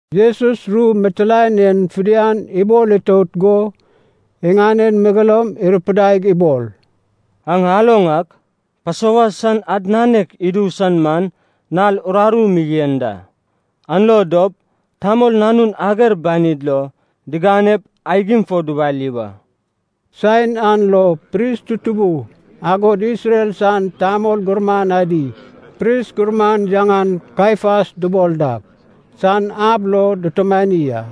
Jesus ru mitilaen en fidian ibol itout go iŋanen megeloum irupidaig ibol, “Aŋ aloŋ ak, Pasova san ad nanek idu san man nal uraru mi yen da. An lo dop Tamol Nanun ager banid lo diganep aigim fo dubali wa.” Saen an lo pris tutubu, agod Isrel san tamol gurman adi, pris gurman yaŋan Kaiafas dubol dak san ab lo dutumani a.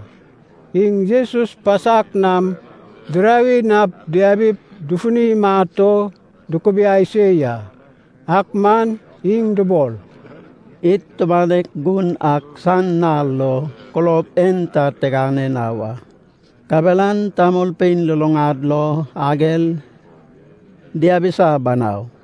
Iŋ Jesus pasak nam dirawi nap diabip dufuni imat o dukubiai se ya. Ak man iŋ dubol, “Id tumanek gun ak san nal lo kulob en ta tigane na wa, kabelan tamolpein luluŋad lo ager diabisa banau.”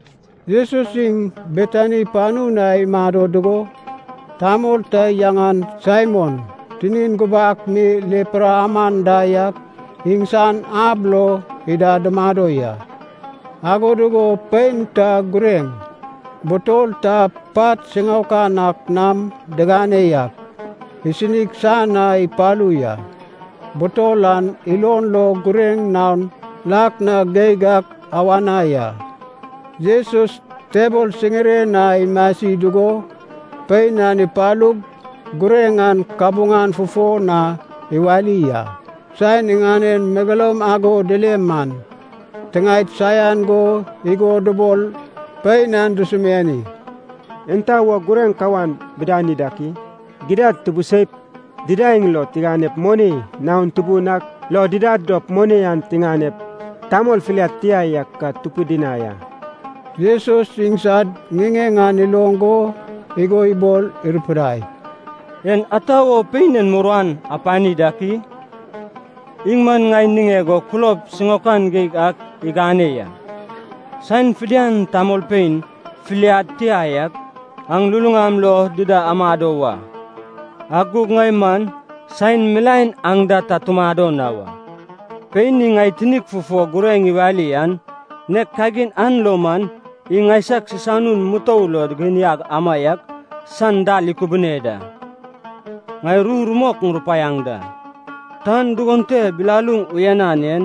Jesus iŋ Betani panu na imado dugo, tamol ta yaŋan Saimon tinin gubak mi lepra aman da yak iŋsan ab lo ida dumado ya. Ago dugo pein ta gureŋ, butol ta pat siŋaokan ak nam digane yak, isinig san na ipalu ya. Butol an ilon lo gureŋ naon lak na geig ak awana ya. Jesus tebol siŋiren na imasi dugo pein an ipalug gureŋ an kabuŋan fufo na iwali a. Saen iŋanen megeloum ago dile man, tiŋaed saian go igo dubol pein an dusumiani, “Enta wo gureŋ kawan bidani dak i? Gidad tubuseip, didaeŋ lo tiganep moni naon tubun ak lo didad dop moni an tiŋanep tamol filiad tia yak ka tupidinai a.” Jesus iŋsad ŋiŋeŋ an iloŋ go igo ibol irupidai, “Enta wo pein en muruan apani dak i? Iŋ man ŋai niŋeg o kulob siŋaokan geig ak igane ya. Saen fidian tamolpein filiad tia yak aŋ luluŋam lo dida amado wa, ak gug ŋai man saen milaen aŋ da ta tumado na wa. Pein iŋ ŋai tinig fufo gureŋ iwali an, nek kagin an lo man iŋ ŋaisag sisanun mutou lo diginiag amaiak san dal ikubune da. Ŋai ru rumok ŋurupaiaŋ da. Tan dugon te bilaluŋ uyanan en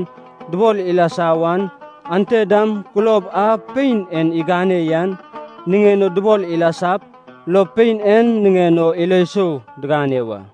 dubol ilasa wan, ante dam kulob a pein en igane yan niŋen o dubol ilasap, lo pein en niŋen o ilo sou digane wa.”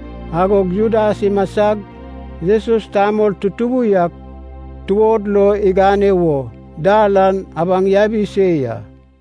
Agog Judas imasag, Jesus tamol tutubu yak tuod lo igane wo, dal an abaŋ yabi se ya.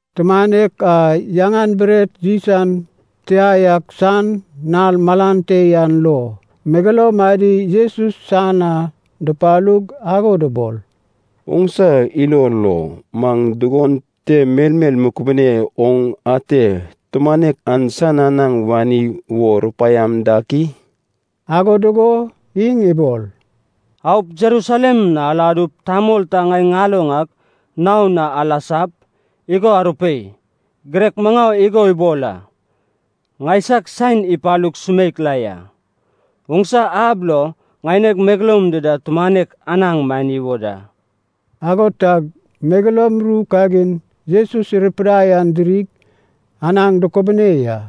Tumanek a yaŋan bret yis an tia yak san nal malan te yan lo, megeloum adi Jesus san na dupalug ago dubol, “Oŋsa ilo lo, maŋ dugon te melmel mukubinep oŋ ate tumanek an san anaŋ wani wo rupaiama dak i?” Ago dugo iŋ ibol, “Aup Jerusalem na aladup tamol ta ŋai ŋaloŋ ak naon na alasap, igo arupei, ‘Girek maŋau igo ibol a. Ŋaisag saen ipalug sumeik la ya. Oŋsa ab lo ŋaineg megeloum dida tumanek anaŋ mani wo da.’” Ago tag megeloum ru kagin Jesus irupidai an dirig, anaŋ dukubune ya.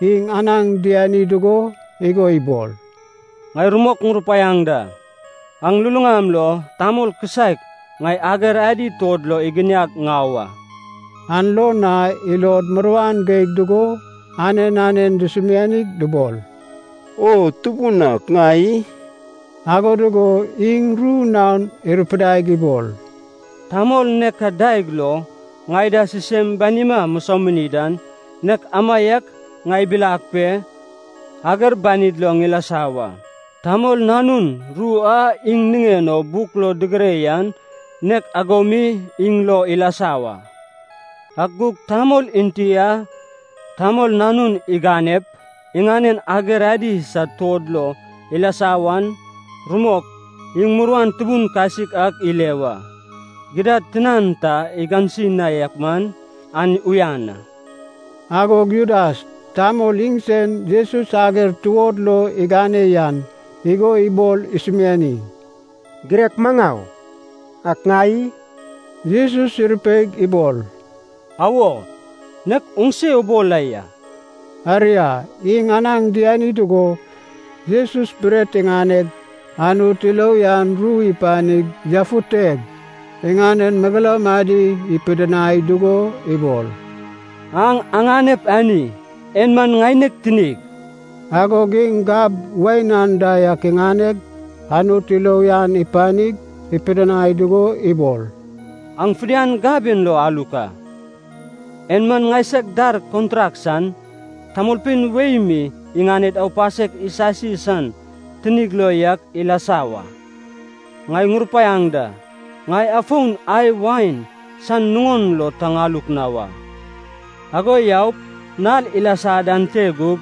Iŋ anaŋ diani dugo igo ibol, “Ŋai rumok ŋurupaiaŋ da. Aŋ lulaŋam lo tamol kisaek, ŋai ager adi tuod lo iginiag ŋau a.” An lo na ilod muruan geig dugo, anen anen dusumianig dubol, “O Tubun ak, ŋai i?” Ago dugo iŋ ru naon irupidaig ibol, “Tamol nek a daeg lo ŋai da sisem banima musomini dan, nek amaiak ŋai ibilag pe ager banid lo ŋilasa wa. Tamol Nanun ru a iŋ niŋen o buk lo digire yan nek ago mi iŋ lo ilasa wa. Ak gug tamol enti a Tamol Nanun iganep iŋanen ager adi sad tuod lo ilasa wan, rumok iŋ muruan tubun kasik ak ile wa! Gidad tinan ta igansi na yak man, an uyan a.” Agog Judas, tamol iŋsen Jesus ager tuod lo igane yan, igo ibol isumiani, “Girek maŋau, ak ŋai i?” Jesus irupeig ibol, “Awo, nek oŋse ubol la ya.” Aria, iŋ anaŋ diani dugo Jesus bret iŋaneg, Anut ilo uyan ru ipanig yafuteg, iŋanen megeloum adi ipidinai dugo ibol, “Aŋ aŋanep ani, en man ŋaineg tinig.” Agog iŋ gab wain anda yak iŋaneg, Anut ilo uyan ipanig, ipidinai dugo ibol, “Aŋ fidian gab en lo aluk a. En man ŋaisag dar kontrak san, tamolpein wei mi iŋaned aupasek isasi san tinig lo yak ilasa wa. Ŋai ŋurupaiaŋ da, ŋai afon ai wain san nuŋon lo ta ŋaluk na wa, ago yaup nal ilasa dan te gup,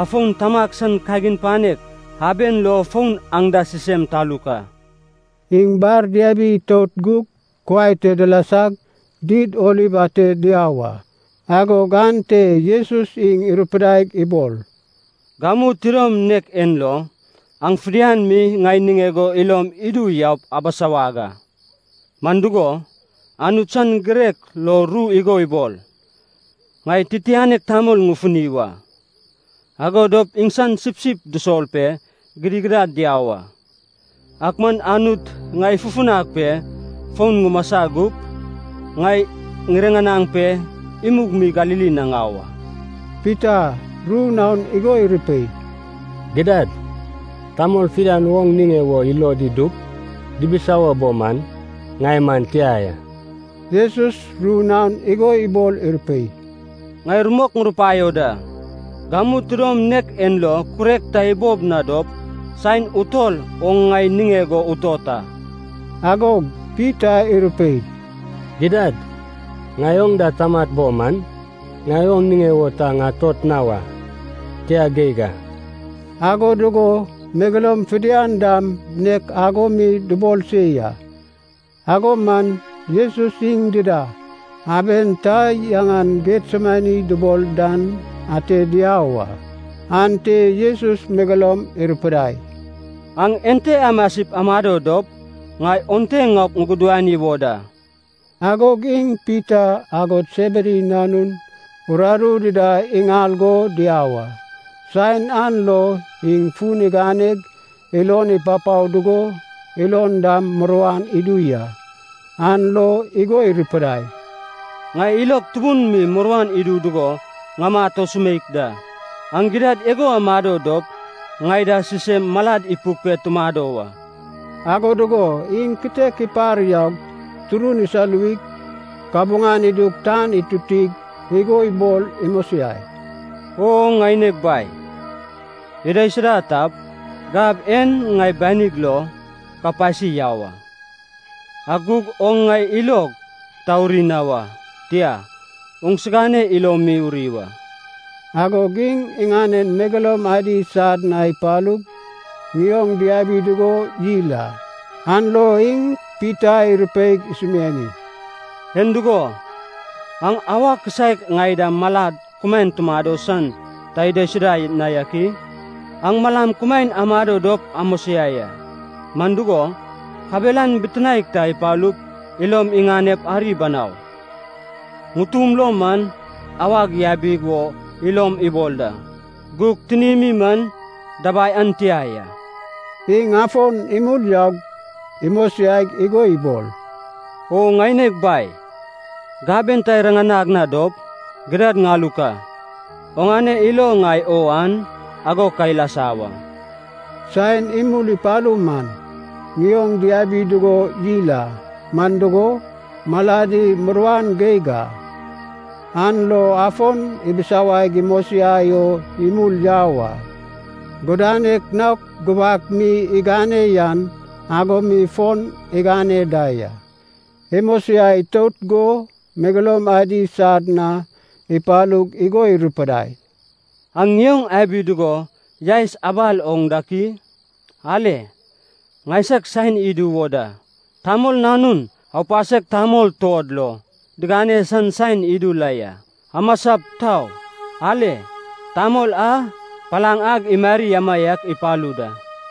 afon Tamag san kagin panek aben lo fon aŋ da sisem taluk a.” Iŋ bar diabi itout gug kuai te dilasag Did Oliv ate diau a. Agog ante Jesus iŋ irupidaig ibol, “Gamu tidom nek en lo, aŋ fidian mi ŋai niŋeg o ilom idup yaup abisawag a. Man dugo, Anut san girek lo ru igo ibol, ‘Ŋai titianek tamol ŋufuni wa, ago dop iŋsan sipsip dusol pe gidigidad diau a.’ Ak man Anut ŋai ifufunag pe fon ŋumasa gup, ŋai ŋiriŋanaŋ pe imug mi Galili na ŋau a.” Pita ru naon igo irupei, “Gidad tamol fidian oŋ niŋe wo ilod idup dibisawo bo man, ŋai man tia ya.” Jesus ru naon igo ibol irupei, “Ŋai rumok ŋurupaio da, gamu tidom nek en lo kurek ta ibob na dop, saen utol oŋ ŋai niŋeg o utot a.” Agog Pita irupei, “Gidad, ŋai oŋ da tamat bo man, ŋai oŋ niŋe wo ta ŋatot na wa, tia geig a!” Ago dugo megeloum fidian dam nek ago mi dubol se ya. Ago man Jesus iŋ dida, aben ta yaŋan Getsemani dubol dan ate diau a. Ante Jesus megeloum irupidai, “Aŋ ente amasip amado dop, ŋai onte ŋaup ŋugudani wo da.” Agog iŋ Pita agod Sebedi nanun uraru dida iŋal go diau a. Saen an lo iŋ fun iganeg ilon ipapao dugo ilon dam muruan idu ya. An lo igo irupidai, “Ŋai ilog tubun mi muruan idu dugo ŋamat o sumeik da. Aŋ gidad igo amado dop ŋai da sisem malad ipuk pe tumado wa.” Ago dugo iŋ kitek ipar yaug, turun isoluwig, kabuŋan idug tan itutig, igo ibol imosiai, “O ŋaineg Bai, idaisuda tap, gab en ŋai banig lo ka pasi yau a. Ak gug oŋ ŋai ilog ta uri na wa, tia, oŋsigane ilo mi uri wa.” Agog iŋ iŋanen megeloum adi sad na ipalug, ŋioŋ diabi dugo yil a. An lo iŋ Pita irupeig isumiani, “En dugo, aŋ auwa kisaek ŋai da malad kumaen tumado san ta idaisuda na yak i? Aŋ malam kumaen amado dop amosiai a, man dugo, kabelan bitinaek ta ipalup ilom iŋanep ari banau. Ŋutum lo man awag yabi wo ilom ibol da, gug tinimi man dabai an tia ya.” Iŋ afon imul yaug imosiaig igo ibol, “O ŋaineg Bai, gab en ta iriŋanag na dop, gidad ŋaluk a. Oŋane ilo ŋai o an, ago ka ilasa wa.” Saen imul ipalu man ŋioŋ diabi dugo yil a, man dugo, maladi muruan geig a. An lo afon ibisawaig imosiai o imul yau a. Gudanek naok gubak mi igane yan ago mi fon igane da ya. Imosiai itout go megeloum adi sad na ipalug igo irupidai, “Aŋ ŋioŋ abi dugo yaes abal oŋ dak i? Ale, ŋaisag saen idu wo da, Tamol Nanun aupasek tamol tuod lo digane san saen idu la ya. Amasap, tau. Ale, tamol a palaŋ ag imari amaiak ipalu da!”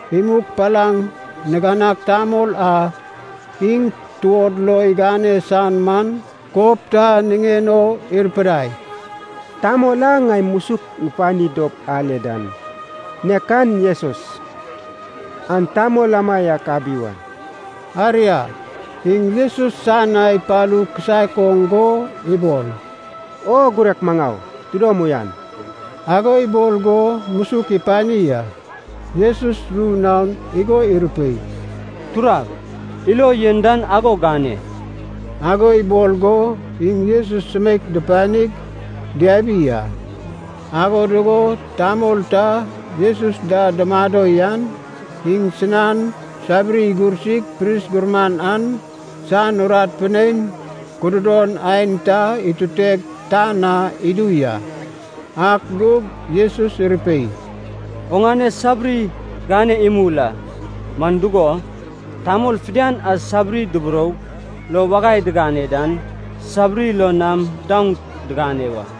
Imug palaŋ niganag tamol a iŋ tuod lo igane san man, kob ta niŋen o irupidai, “Tamol a ŋai musuk ŋupani dop ale dan, nek an Jesus, aŋ tamol amaiak abi wa.” Aria, iŋ Jesus san na ipalu kisaek oŋ go ibol, “O girek maŋau, tidom uyan.” Ago ibol go musuk ipani a. Jesus ru naon igo irupei, “Turag, ilo yen dan ago gane.” Ago ibol go iŋ Jesus sumeik dupanig diabi a. Ago dugo tamol ta Jesus da dumado yan, iŋsinan sabiri igursig pris gurman an san urat pinein kududon aen ta ituteg tan na idu ya. Ak gug Jesus irupei, “Oŋane sabiri gane imul a. Man dugo, tamol fidian a sabiri duburoup lo wagai digane dan, sabiri lo nam daoŋ diŋane wa.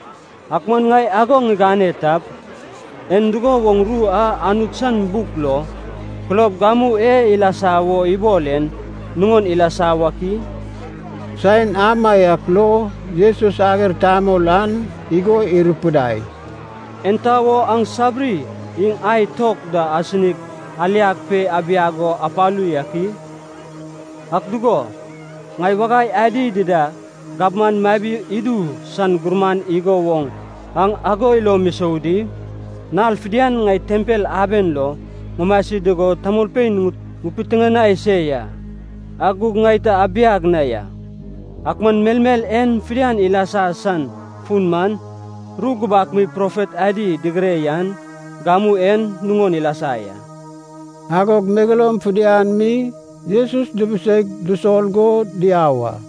Ak man ŋai ago ŋigane tap, en dugo woŋ ru a Anut san buk lo, kulob gamu e ilasa wo ibol en, nuŋon ilasa wak i?” Saen amaiak lo Jesus ager tamol an igo irupidai, “Enta wo aŋ sabiri iŋ ai tok da asinig aliag pe abiag o apalu yak i? Ak dugo, ŋai wagai adi dida gabman mabi idu san gurman igo woŋ aŋ ago ilom isou di? Nal fidian ŋai tempel aben lo ŋumasi dugo tamolpein ŋupiteŋanai se ya, ak gug ŋai ta abiag na ya. Ak man melmel en fidian ilasa san fun man, ru gubak mi profet adi digire yan gamu en nuŋon ilasa ya.” Agog megeloum fidian mi Jesus dubuseig dusol go diau a.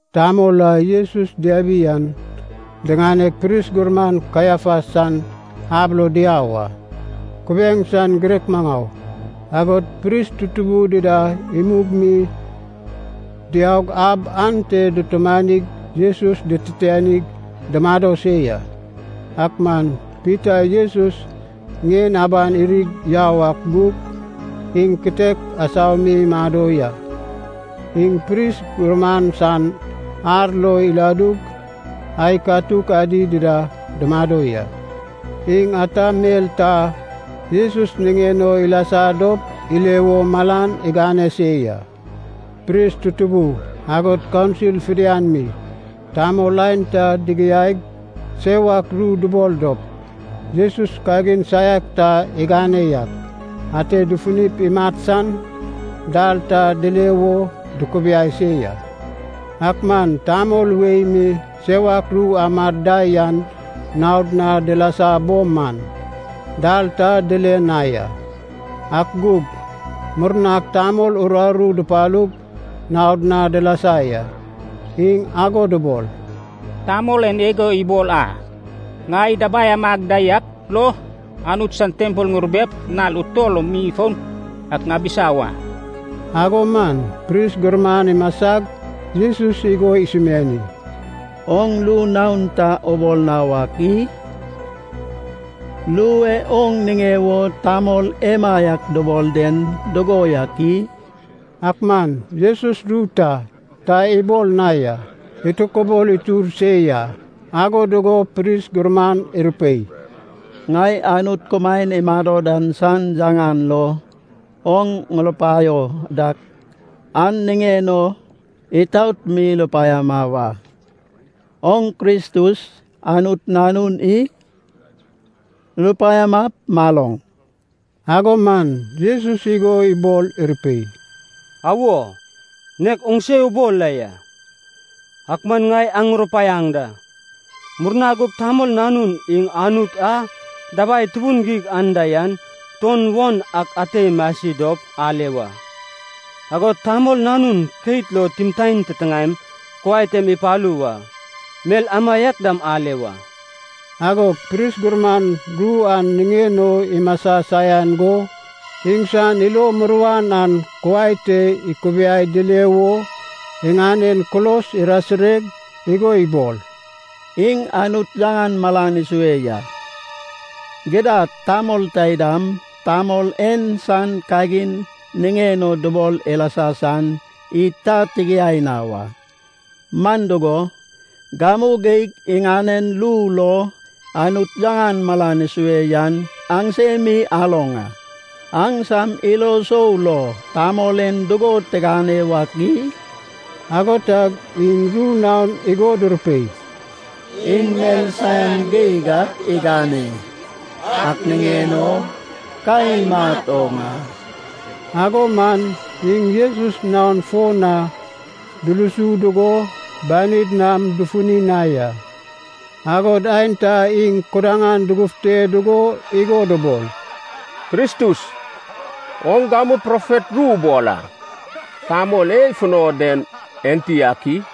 Tamol a Jesus diabi an, diŋaneg pris gurman Kaiafas san ab lo diau a. Kubiaeŋ san girek maŋau, agod pris tutubu dida imug mi diaug ab ante dutumanig Jesus dititianig dumado se ya. Ak man Pita Jesus ŋien aban irig yau ak gug, iŋ kitek asau mi imado ya. Iŋ pris gurman san ar lo iladug ai katuk adi dida dumado ya. Iŋ ata mel ta Jesus niŋen o ilasa dop ile wo malan igane se ya. Pris tutubu, agod kaunsil fidian mi, tamol aenta digiaig sewak ru dubol dop, Jesus kagin saiak ta igane yak, ate dufunip imat san dal ta dile wo dukubiai se ya. Ak man tamol wei mi sewak ru amad da yan naod na dilasa bo man, dal ta dile na ya. Ak gug murnag tamol uraru dupalug naod na dilasa ya, iŋ ago dubol, “Tamol en igo ibol a, ‘Ŋai dabai amag da yak lo Anut san tempel ŋurubep, nal utol lo mi foun ak ŋabisa wa.’” Ago man pris gurman imasag Jesus igo isumiani, “Oŋ ru naon ta ubol na wak i? Ru e oŋ niŋe wo tamol emaiak dubol den dugo yak i?” Ak man Jesus ru ta, ta ibol na ya, itokibol itur se ya. Ago dugo pris gurman irupei, “Ŋai Anut kumaen imado dan san yaŋan lo, oŋ ŋurupaio dak an niŋen o, itaot mi rupaiama wa. Oŋ Kristus, Anut Nanun i? Rupaiamap maloŋ.” Ago man Jesus igo ibol irupei, “Awo, nek oŋse ubol la ya. Ak man ŋai aŋ ŋurupaiaŋ da, murna gup Tamol Nanun iŋ Anut a dabai tubun geig anda yan tuon won ak ate imasi dop ale wa. Agod Tamol Nanun keit lo timtaen titiŋaem kuai tem ipalu wa, mel amaiak dam ale wa.” Agog pris gurman, ru an niŋen o imasa saian go, iŋsan ilo muruan an kuai te ikubiai dile wo iŋanen kulos irasireg igo ibol, “Iŋ Anut yaŋan malan isue ya. Gidad, tamol taidam, tamol en san kagin niŋen o dubol ilasa san id ta tigiai na wa. Man dugo, gamu geig iŋanen ru lo Anut yaŋan malan isue yan aŋsemi aloŋ a. Aŋsam ilo sou lo, tamol en dugo tigane wak i?” Ago tag iŋ ru naon igo durupei, “Iŋ mel saian geig ak igane, ak niŋen o ka imat oŋ a.” Ago man iŋ Jesus naon fo na dulusu dugo banid nam dufuni na ya, agod aenta iŋ kudaŋan dugufute dugo igo dubol, “Kristus, oŋ gamu profet ru ubol a, tamol e ifuno den enti ak i?”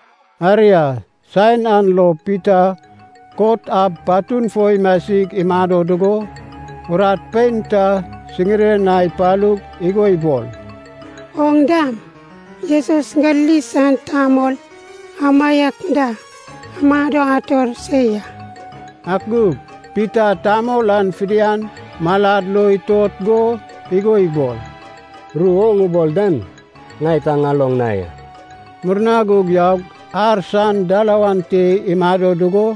Aria, saen an lo Pita kot ab patun fo imasig imado dugo, urat pein ta siŋiren na ipalug igo ibol, “Oŋ dam Jesus Galili san tamol amaiak da amado ator se ya.” Ak gug Pita tamol an fidian malad lo itot go igo ibol, “Ru oŋ ubol dan ŋai ta ŋaloŋ na ya.” Murna gug yaug ar san dalawan te imado dugo,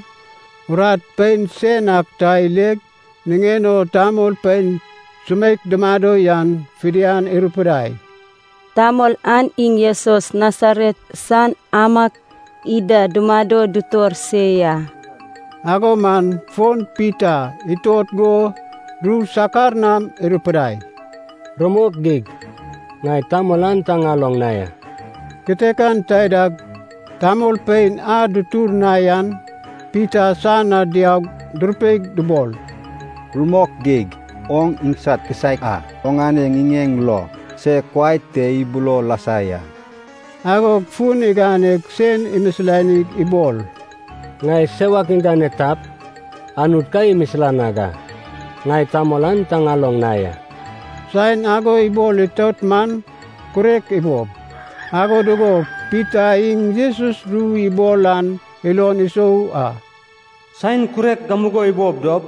urat pein sen ak ta ileg, niŋen o tamolpein sumeik dumado yan fidian irupidai, “Tamol an iŋ Jesus Nasaret san amaiak ida dumado dutor se ya.” Ago man fon Pita itot go ru sakar nam irupidai, “Rumok geig ŋai tamol an ta ŋaloŋ na ya!” Kitekan taidag tamolpein a dutur na yan Pita san na diaug durupeig dubol, “Rumok geig, oŋ iŋsad kisaek a. Oŋane ŋiŋeŋ lo se kuai te ibulo lasa ya.” Agog fun iganeg sen imisilanig ibol, “Ŋai sewak ŋigane tap Anut ka imisilanag a! Ŋai tamol an ta ŋaloŋ na ya!” Saen ago ibol itout man, kurek ibob. Ago dugo Pita iŋ Jesus ru ibol an ilon isou a, “Saen kurek gamugo ibob dop,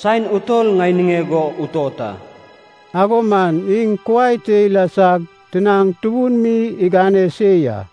saen utol ŋai niŋeg o utot a.” Ago man iŋ kuai te ilasag tinaŋ tubun mi igane se ya.